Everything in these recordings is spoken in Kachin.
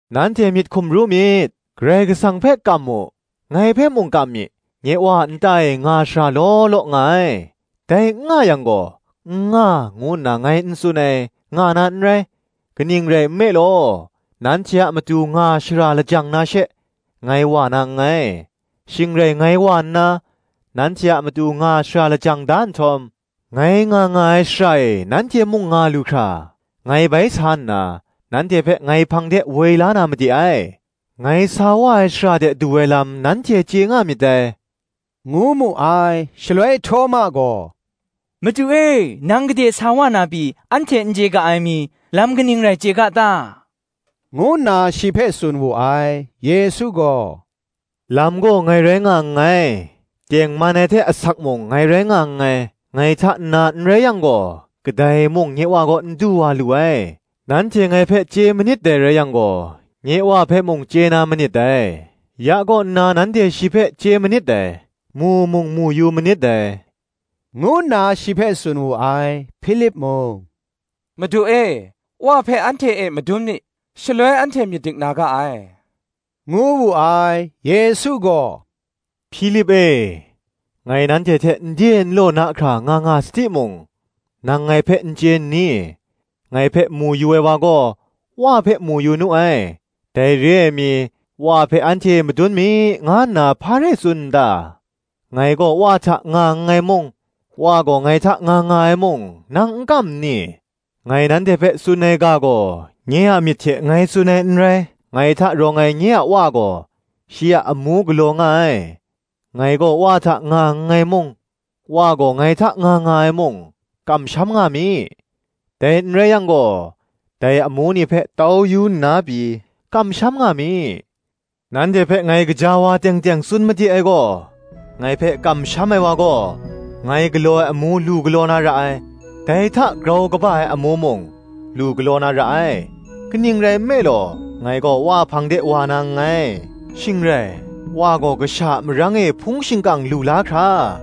“Nanhte myit hkum ru myit: Karai Kasang hpe kam mu, ngai hpe mung kam mi. Nye wa a nta e nga shara law law nga ai; dai n nga yang gaw, N nga, ngu nna ngai n tsun ai, nga na n rai: kaning rai nme law, nanhte a matu nga shara lajang na she, ngai wa na nngai. Shing rai ngai wa nna, nanhte a matu nga shara lajang da nhtawm, ngai nga nga ai shara e nanhte mung nga lu hkra, ngai bai sa nna, nanhte hpe ngai hpang de woi la na made ai. Ngai sa wa ai shara de du ai lam nanhte chye nga myit dai,” ngu mu ai. Shaloi Htawma gaw, “Madu e, nang gade sa wa na pyi, anhte n chye ga ai mi, lam kaning rai chye ga ta?” ngu nna shi hpe tsun wu ai. Yesu gaw, “Lam gaw ngai rai nga nngai, tengman ai hte asak mung, ngai rai nga nngai: ngai hta nna n rai yang gaw, kadai mung nye Wa kaw n du wa lu ai. Nanhte ngai hpe chye manit dai rai yang gaw, nye Wa hpe mung chye na manit dai: ya kaw nna nanhte shi hpe chye manit dai, mu mung mu manit dai,” ngu nna shi hpe tsun wu ai. Hpilip mung, “Madu e, Wa hpe anhte e madun mi, shaloi anhte myit dik na ga ai,” ngu wu ai. Yesu gaw, “Hpilip e, ngai nanhte hte nde nlaw na hkra nga nga sa timung, nang ngai hpe n chye nni? Ngai hpe mu yu ai wa gaw, Wa hpe mu yu nu ai: dai re ai mi, Wa hpe anhte e madun mi, nga nna hpa rai tsun n ta? Ngai gaw Wa hta nga nngai mung, Wa gaw ngai hta nga nga ai mung, nang n kam nni? ngai nanhte hpe tsun ai ga gaw nye a myit hte ngai tsun ai n rai: ngai hta rawng ai nye a Wa gaw, shi a amu galaw nga ai. Ngai gaw Wa hta nga nngai mung, Wa gaw ngai hta nga nga ai mung, kamsham nga mi: dai n rai yang gaw, dai amu ni hpe tau yu nna pyi, kamsham nga mi. Nanhte hpe ngai gaja wa teng teng tsun made ai gaw, Ngai hpe kamsham ai wa gaw, ngai galaw ai amu lu galaw na ra ai; dai hta grau kaba ai amu mung, lu galaw na ra ai: kaning rai nme law, ngai gaw Wa hpang de wa na nngai. Shing rai, Wa gaw Kasha a marang e hpung shingkang lu la hkra,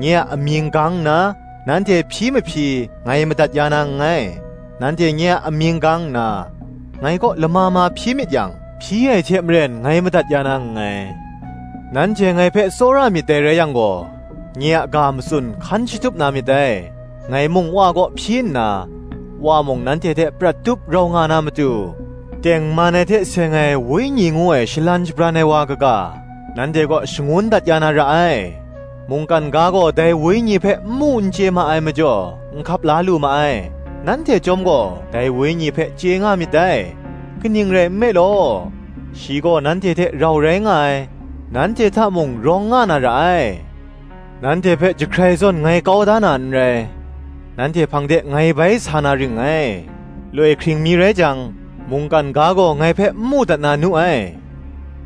nye a amying gang nna, nanhte hpyi mahpyi, ngai madat ya na nngai. Nanhte nye a amying gang nna, ngai kaw lama ma hpyi myit yang, hpyi ai hte maren ngai madat ya na nngai. Nanhte ngai hpe tsawra myit dai rai yang gaw, nye a ga matsun hkan shatup na myit dai. Ngai mung Wa kaw hpyi nna, Wa mung, nanhte hte prat tup rau nga na matu, tengman ai hte seng ai Wenyi ngu ai Shalan Shabran ai wa kaga, nanhte kaw shangun dat ya na ra ai. mungkan ga gaw dai Wenyi hpe n mu n chye ma ai majaw, n hkap la lu ma ai: nanhte chyawm gaw dai Wenyi hpe chye nga myit dai; kaning rai nme law, shi gaw nanhte hte rau rai nga ai, nanhte hta mung rawng nga na ra ai. Nanhte hpe jahkrai zawn ngai kau da na n rai: nanhte hpang de ngai bai sa na ring ngai. Loi hkring mi rai jang, mungkan ga gaw ngai hpe n mu dat na nu ai: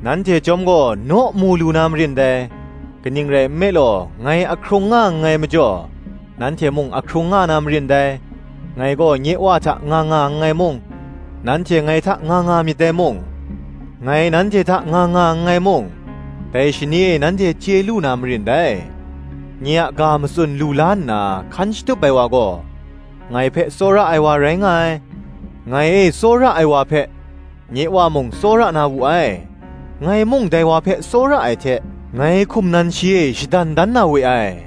nanhte chyawm gaw naw mu lu na marin dai: kaning rai nme law ngai ahkrung nga nngai majaw, nanhte mung ahkrung nga na marin dai. Ngai gaw nye Wa hta nga nga nngai mung, nanhte ngai hta nga nga myit dai mung, ngai nanhte hta nga nga nngai mung, dai shani e nanhte chye lu na marin dai. Nye a ga matsun lu la nna hkan shatup ai wa gaw, ngai hpe tsawra ai wa rai nga ai: ngai e tsawra ai wa hpe, nye Wa mung tsawra na wu ai: ngai mung dai wa hpe tsawra ai hte, ngai hkum nan shi e shadan dan na we ai,”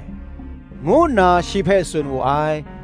ngu nna shi hpe tsun wu ai.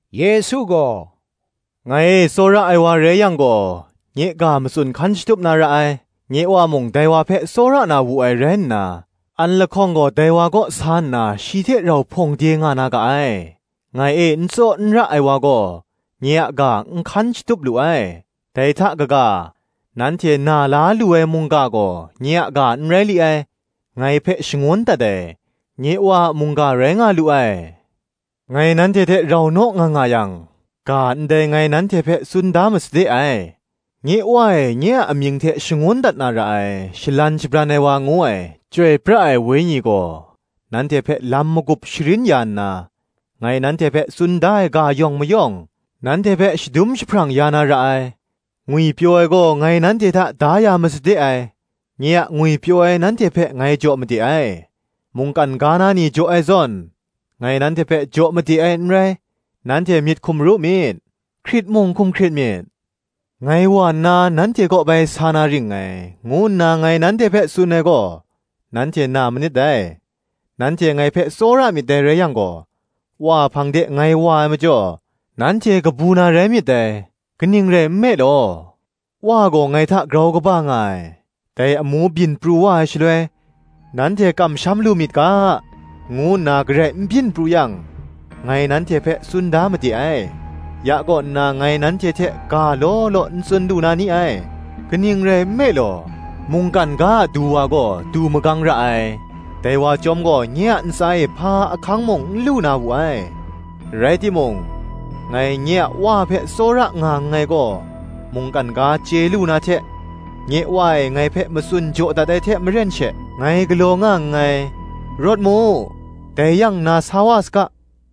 Yesu gaw, “Ngai e tsawra ai wa rai yang gaw, nye ga matsun hkan shatup na ra ai: nye Wa mung dai wa hpe tsawra na wu ai rai nna, an lahkawng gaw dai wa kaw sa nna shi hte rau hpawng de nga na ga ai. Ngai e n tsaw n ra ai wa gaw, nye a ga n hkan shatup lu ai, dai hta kaga, nanhte na la lu ai mungga gaw, nye a ga n rai li ai, ngai hpe shangun dat ai, nye Wa a mungga rai nga lu ai. Ngai nanhte hte rau naw nga nga yang, ga ndai ngai nanhte hpe tsun da masade ai. Nye Wa e nye a amying hte shangun dat na ra ai, Shalan Shabran ai wa ngu ai, Chyoi pra ai Wenyi gaw, nanhte hpe lam magup sharin ya nna, ngai nanhte hpe tsun da ai ga yawng mayawng, nanhte hpe shadum jahprang ya na ra ai. Ngwipyaw ai gaw ngai nanhte hta da ya masade ai; nye a ngwipyaw ai nanhte hpe ngai jaw made ai: mungkan ga na ni jaw ai zawn, ngai nanhte hpe jaw made ai n rai. Nanhte myit hkum ru myit, hkrit mung hkum hkrit myit. Ngai wa nna, nanhte kaw bai sa na ring ngai, ngu nna ngai nanhte hpe tsun ai gaw, nanhte na manit dai: nanhte ngai hpe tsawra myit dai rai yang gaw, Wa hpang de ngai wa ai majaw, nanhte kabu na rai myit dai; kaning rai nme law, Wa gaw ngai hta grau kaba nga ai. Dai amu byin pru wa ai shaloi, nanhte kamsham lu myit ga, ngu nna garai n byin pru yang, ngai nanhte hpe tsun da made ai. Ya kaw nna ngai nanhte hte ga law law n tsun lu na ni ai: kaning rai nme law, mungkan ga a Du wa gaw, du magang ra ai: dai wa chyawm gaw nye a ntsa e hpa ahkang mung n lu na wu ai: rai timung, ngai nye a Wa hpe tsawra nga nngai gaw, mungkan ga chye lu na hte, nye Wa e ngai hpe matsun jaw dat ai hte maren she, ngai galaw nga nngai. Rawt mu, dai yang nna sa wa saga.